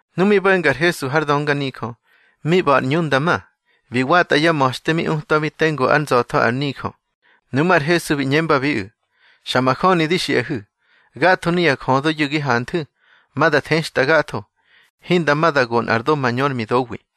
Nu mi bo̱nga ar Hesu har dönganijö, mi ꞌba̱ ar ꞌñu nda ma, bi watꞌa yá ma̱xte mi utwabi tengu ár nza̱tho ar nijö. Nuꞌmú̱ ar Hesu bi ꞌñembabiꞌu̱: —Xa majöni di xiꞌahu̱: Gatho nuya jödoyu̱ gi hanthu̱, ma da thextꞌa gatho. Hinda ma da go nꞌar do mañö ár midowi.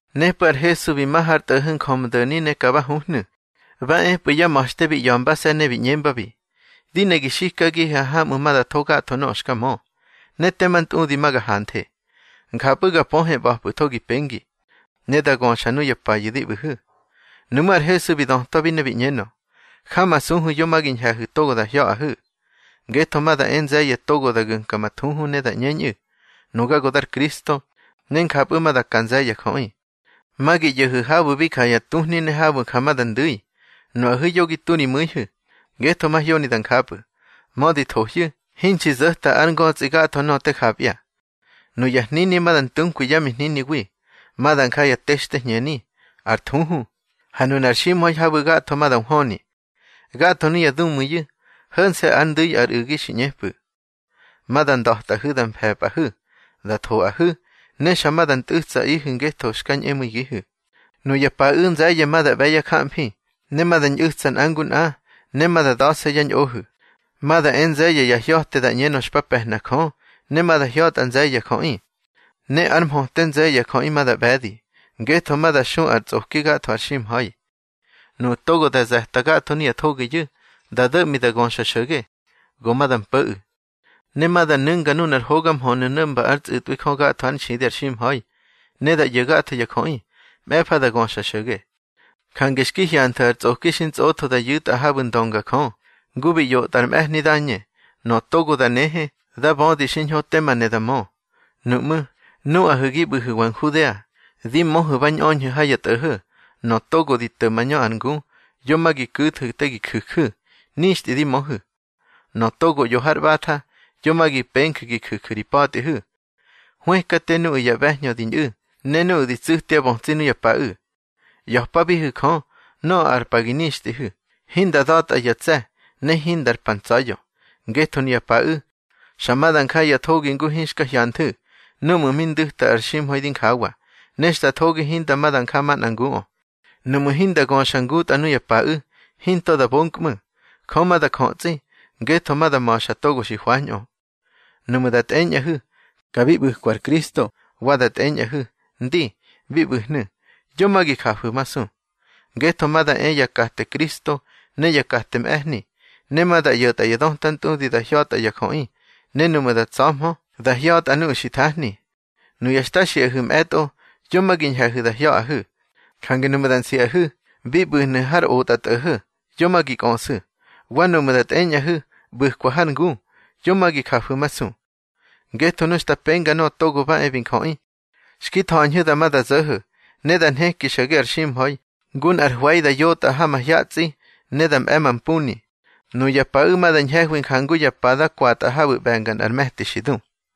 Nepꞌu̱ ar Hesu bi ma har tꞌo̱ho̱ Njömdo̱ni ne ka ba huhnu̱. Ba epꞌu̱ yá ma̱xte bi ꞌya̱mbase̱ ne bi ꞌñembabi: —Di ne gi xikagihe hamꞌu̱ ma da tho gatho nöꞌö xka mö, ne tema ntꞌudi ma ga hanthe, njapꞌu̱ ga pöhe ꞌba̱pꞌu̱tho gi pengi, ne da göxa nuya payu̱ di ꞌbu̱hu̱. Nuꞌmú̱ ar Hesu bi dötwabi ne bi ꞌñenö: —Jamasuhu̱ yo ma gi ñhe̱hu̱ to da hya̱ꞌahu̱. Ngetho ma da e nze̱ye̱ togo ma da gu̱mka ma thuhu ne da ꞌñeñꞌu̱: Nuga go dar Kristo. Ne njapꞌu̱ ma da ka nze̱ye̱ ya jöꞌi. Ma gi ꞌyo̱hu̱ habu̱ bi ja ya tuhni ne habu̱ ja ma da ndu̱i. Nuꞌahu̱ yo gi tu ri mu̱ihu̱, ngetho mahyoni da njapꞌu̱. Mödi thohyu̱, hinxi zo̱ta ár ngötsꞌi gatho nöꞌö te japya. Nuya hnini ma da ntunkwi yá mihniniwi. Ma da nja ya textehñeni, ar thuhu, ha nunar ximha̱i habu̱ gatho ma da nhwöni. Gatho nuya dumu̱iyu̱, ho̱nse̱ ár ndu̱i ar u̱gi xi ꞌñepꞌu̱. Ma da nda̱tꞌahu̱ da mfe̱pꞌahu̱, da thoꞌahu̱, ne xa ma da ntꞌu̱tsaꞌihu̱ ngetho xka ñꞌemu̱igihu̱. Nuya paꞌu̱ nze̱ye̱ ma da ꞌbe̱ yá jamfi, ne ma da ñꞌu̱tsa nꞌa ngu nꞌa, ne ma da da̱se̱ yá ñꞌohu̱. Ma da e nze̱ye̱ ya hya̱te da ꞌñenö xpa pe̱hna Jö, ne ma da hya̱tꞌa nze̱ye̱ ya jöꞌi. Ne ár mhöte nze̱ye̱ ya jöꞌi ma da ꞌbe̱di, ngetho ma da xu ar tsꞌoki gatho har ximha̱i. Nuꞌu̱ togo da ze̱ta gatho nuya thogiyu̱, da do̱ꞌmi da göxa xo̱ge, go ma da mpo̱ꞌu̱. Ne ma da nu̱nga nunar hoga mhönu̱ no̱mba ár tsꞌu̱tꞌwi Jö gatho ár nxidi ar ximha̱i, ne da ꞌyo̱ gatho ya jöꞌi. Mꞌe̱fa da göxa xo̱ge. Jange xki hyanthu̱ ar tsꞌoki xi ntsꞌotho da yu̱tꞌa habu̱ ndönga Jö, ngu bi ꞌyotꞌa ar mꞌe̱hni Dañe (nöꞌö togo da nehe, dá bödi xiñho tema ne da mö), nuꞌmú̱, nuꞌahu̱ gi ꞌbu̱hu̱wa Nhudea, di möhu̱ ba ñꞌöñhu̱ ha ya tꞌo̱ho̱. Nöꞌö togo di to̱ mañö ar ngu, yo ma gi ku̱thu̱ te gi ju̱ju̱. Nixtꞌi di möhu̱. Nöꞌö togo ꞌyo har ꞌbatha, yo ma gi penju̱ gi ju̱ju̱ ri pa̱tꞌihu̱. Hwëkate nuꞌu̱ ya ꞌbe̱hñö di ñꞌu̱, ne nuꞌu̱ di tsu̱tyá bötsi nuya paꞌu̱. ꞌYa̱pabihu̱ Jö, nöꞌö ar pa gi nixtꞌihu̱, hinda da̱tꞌa ya tse̱, ne hindar pa ntsa̱ya̱. Ngetho nuya paꞌu̱, xa ma da nja ya thogi ngu hinxka hyanthu̱ núꞌmu̱ mi ndu̱ta ar ximha̱i di njawa, ne xta thogi hinda ma da nja manꞌa nguꞌö. Nuꞌmu̱ hinda göxa ngutꞌa nuya paꞌu̱, hinto da bonkꞌmu̱. Jö ma da jötsꞌi, ngetho ma da ma̱xa togo xi hwañꞌö. Nuꞌmu̱ da tꞌeñꞌahu̱: Ka bi ꞌbu̱kwa ar Kristo, wa da tꞌeñꞌahu̱: Ndi, bi ꞌbu̱hnu̱, yo ma gi jafu̱masu. Ngetho ma da e ya kate Kristo ne ya kate mꞌe̱hni. Ma da ꞌyo̱tꞌa ya döta ntꞌudi da hya̱tꞌa ya jöꞌi, ne nuꞌmu̱ da tsa̱hmö, da hya̱tꞌa nuꞌu̱ xi thahni. Nuya xta xiꞌahu̱ mꞌe̱tꞌo, yo ma gi ñhe̱hu̱ da hya̱ꞌahu̱. Jange nuꞌmu̱ da siꞌahu̱: Bi ꞌbu̱hnu̱ har otꞌatꞌo̱ho̱, yo ma gi kꞌöꞌsu̱. Wa nuꞌmu̱ da tꞌeñꞌahu̱: ꞌBu̱kwa har ngu, yo ma gi jafu̱masu. Ngetho nu xta penga Nöꞌö Togo ba e bi Njöꞌi, xki tha̱ñhu̱ dama da zo̱ho̱. Ne da nheki xo̱ge ar ximha̱i, ngu nꞌar hwe̱i da yotꞌa ha mahyatsꞌi ne di mꞌe̱ mampuni. Nuya paꞌu̱ ma da ñhe̱hwi jangu ya pada kwatꞌa habu̱ ꞌbe̱nga nꞌar me̱ti xi du.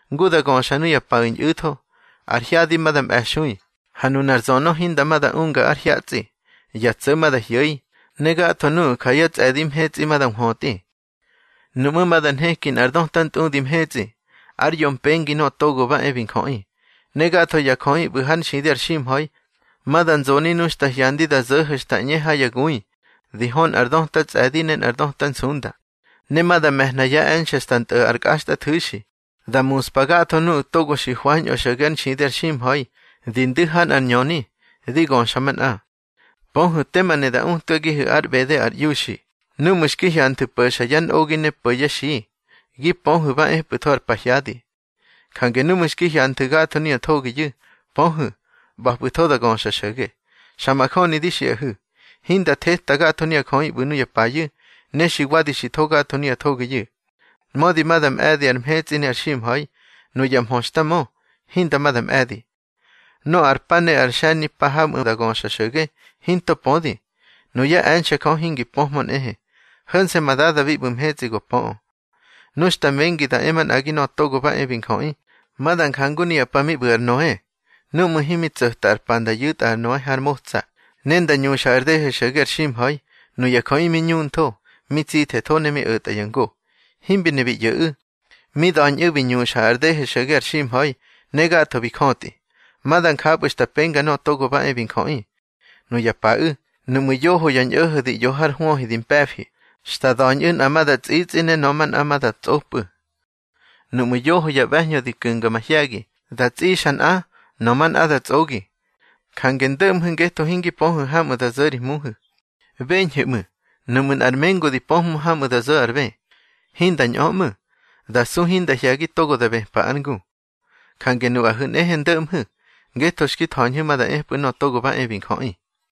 Ngu da göxa nuya paꞌu̱ ñꞌu̱tho, ar hyadi ma da mꞌe̱xui, ha nunar zönö hinda ma da unga ár hyatsꞌi. Ya tso̱ ma da hyo̱i, ne gatho nuꞌu̱ ja yá tsꞌe̱di mhetsꞌi ma da nhwötꞌi. Nuꞌmú̱ ma da nheki nꞌar döta ntꞌudi mhetsꞌi ár yo mpengi Nöꞌö Togo ba e bi Njöꞌi. Ne gatho ya jöꞌi ꞌbu̱ hár nxidi ar ximha̱i, ma da nzoni nu xta hyandi da zo̱ho̱ xta ꞌñe ha ya gui, di hö nꞌar döta tsꞌe̱di ne nꞌar döta nsunda. Ne ma da me̱hna yá e̱nxe̱ xta ntꞌo̱ ar kꞌaxtꞌathu̱xi, da muspa gatho nuꞌu̱ togo xi hwañꞌö xo̱ge ár nxidi ar ximha̱i, di ndu̱ ha nꞌár ñöni, di göxa manꞌa. Pöhu̱ tema ne da utkagihu̱ ár ꞌbede ar iuxi: Núꞌmu̱ xki hyanthu̱ po̱xa yá nꞌogi ne po̱ yá xi, gi pöhu̱ ba epꞌu̱tho ar pahyadi. Jange núꞌmu̱ xki hyanthu̱ gatho nuya thogiyu̱, pöhu̱, ꞌba̱pꞌu̱tho da göxa xo̱ge. Xa majöni di xiꞌahu̱, hinda theta gatho nuya jöꞌi ꞌbu̱ nuya payu̱, ne xi wadi xi tho gatho nuya thogiyu̱. Mödi da mꞌe̱di ar mhetsꞌi ne ar ximha̱i, nuya mhö xta mö, hinda ma da mꞌe̱di. Nöꞌö ar pa ne ar xe̱nimpa hamꞌu̱ da göxa xo̱ge, hinto pödi. Nuyá e̱nxe̱ Jö hingi pöhmö nꞌehe, ho̱nse̱ ma Dada bi ꞌbu̱ mhetsꞌi go pöꞌö. Nu xta mengi da e manꞌagi Nöꞌö Togo ba e bi Njöꞌi, ma da njangu nuya pa mi ꞌbu̱ ar Noe. Núꞌmu̱ himi tso̱ta ar pa nda yu̱tꞌa ar Noe har motsa, ne nda ñuxa ar dehe xo̱ge ar ximha̱i, nuya jöꞌi mi ñuntho, mi tsithetho ne mi o̱tya ngo. Himbi ne bi ꞌyo̱ꞌu̱, mi da̱ñꞌu̱ bi ñuxa ar dehe xo̱ge ar ximha̱i, ne gatho bi jötꞌi. Ma da njapꞌu̱ xta penga Nöꞌö Togo ba e bi Njöꞌi. Nuya paꞌu̱, nuꞌmu̱ yoho ya ñꞌo̱ho̱ di ꞌyo har hwöhi di mpe̱fi, xta da̱ñꞌu̱ nꞌa ma da tsꞌitsꞌi ne nöꞌö manꞌa ma da tsꞌopꞌu̱. Nuꞌmu̱ yoho ya ꞌbe̱hñö di ku̱nga mahye̱gi, da tsꞌixa nꞌa, nöꞌö manꞌa da tsꞌogi. Jange ndo̱ꞌmhu̱, ngetho hingi pöhu̱ hamꞌu̱ da zo̱ ri Hmuhu̱. Beñhu̱ ꞌmu̱, nuꞌmu̱ nꞌar mengu di pöhmö hamꞌu̱ da zo̱ ar bë, hinda ñꞌö ꞌmu̱. Da su hinda hye̱gi togo da bëpa ár ngu. Jange nuꞌahu̱ nꞌehe ndo̱ꞌmhu̱, ngetho xki tha̱ñhu̱ ma da epꞌu̱ Nöꞌö Togo ba e bi Njöꞌi.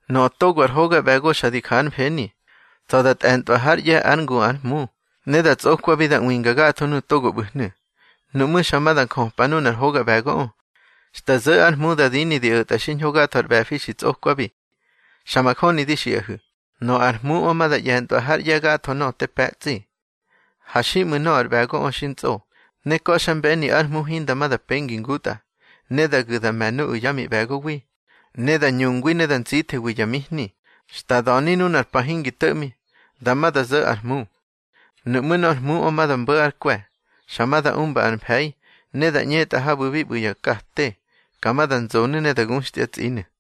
Nöꞌö togo ar hoga ꞌbe̱go xa di ja ár mfeni, tsa̱ da tꞌe̱ntꞌwa hár ꞌye̱ ár ngu ár hmu, ne da tsꞌokwabi da ꞌwinga gatho nuꞌu̱ togo ꞌbu̱hnu̱. Nuꞌmú̱ xa ma da njöpa nunar hoga ꞌbe̱goꞌö, xta zo̱ ár hmu da dini di o̱tꞌa xiñho gatho ar ꞌbe̱fi xi tsꞌokwabi. Xa majöni di xiꞌahu̱, nöꞌö ar hmuꞌö ma da ꞌye̱ntꞌwa hár ꞌye̱ gatho nöꞌö te pe̱tsꞌi. Ha xiꞌmu̱ nöꞌö ar ꞌbe̱goꞌö xi ntsꞌo, ne ka̱xmbeni ár hmu hinda ma da penga ngutꞌa. Ne da gu̱ da me̱ nuꞌu̱ yá miꞌbe̱gowi, ne da ñungwi ne da ntsithewi ya mihni. Xta da̱ni nunar pa hingi to̱ꞌmi, dama da zo̱ ár hmu. Nuꞌmú̱ nor hmuꞌö ma da mbo̱ ár kwe̱, xa ma da umba ar mfe̱i, ne da ꞌñetꞌa habu̱ bi ꞌbu̱ ya kate. Ka ma da nzonu̱ ne da guxtyá tsꞌinu̱.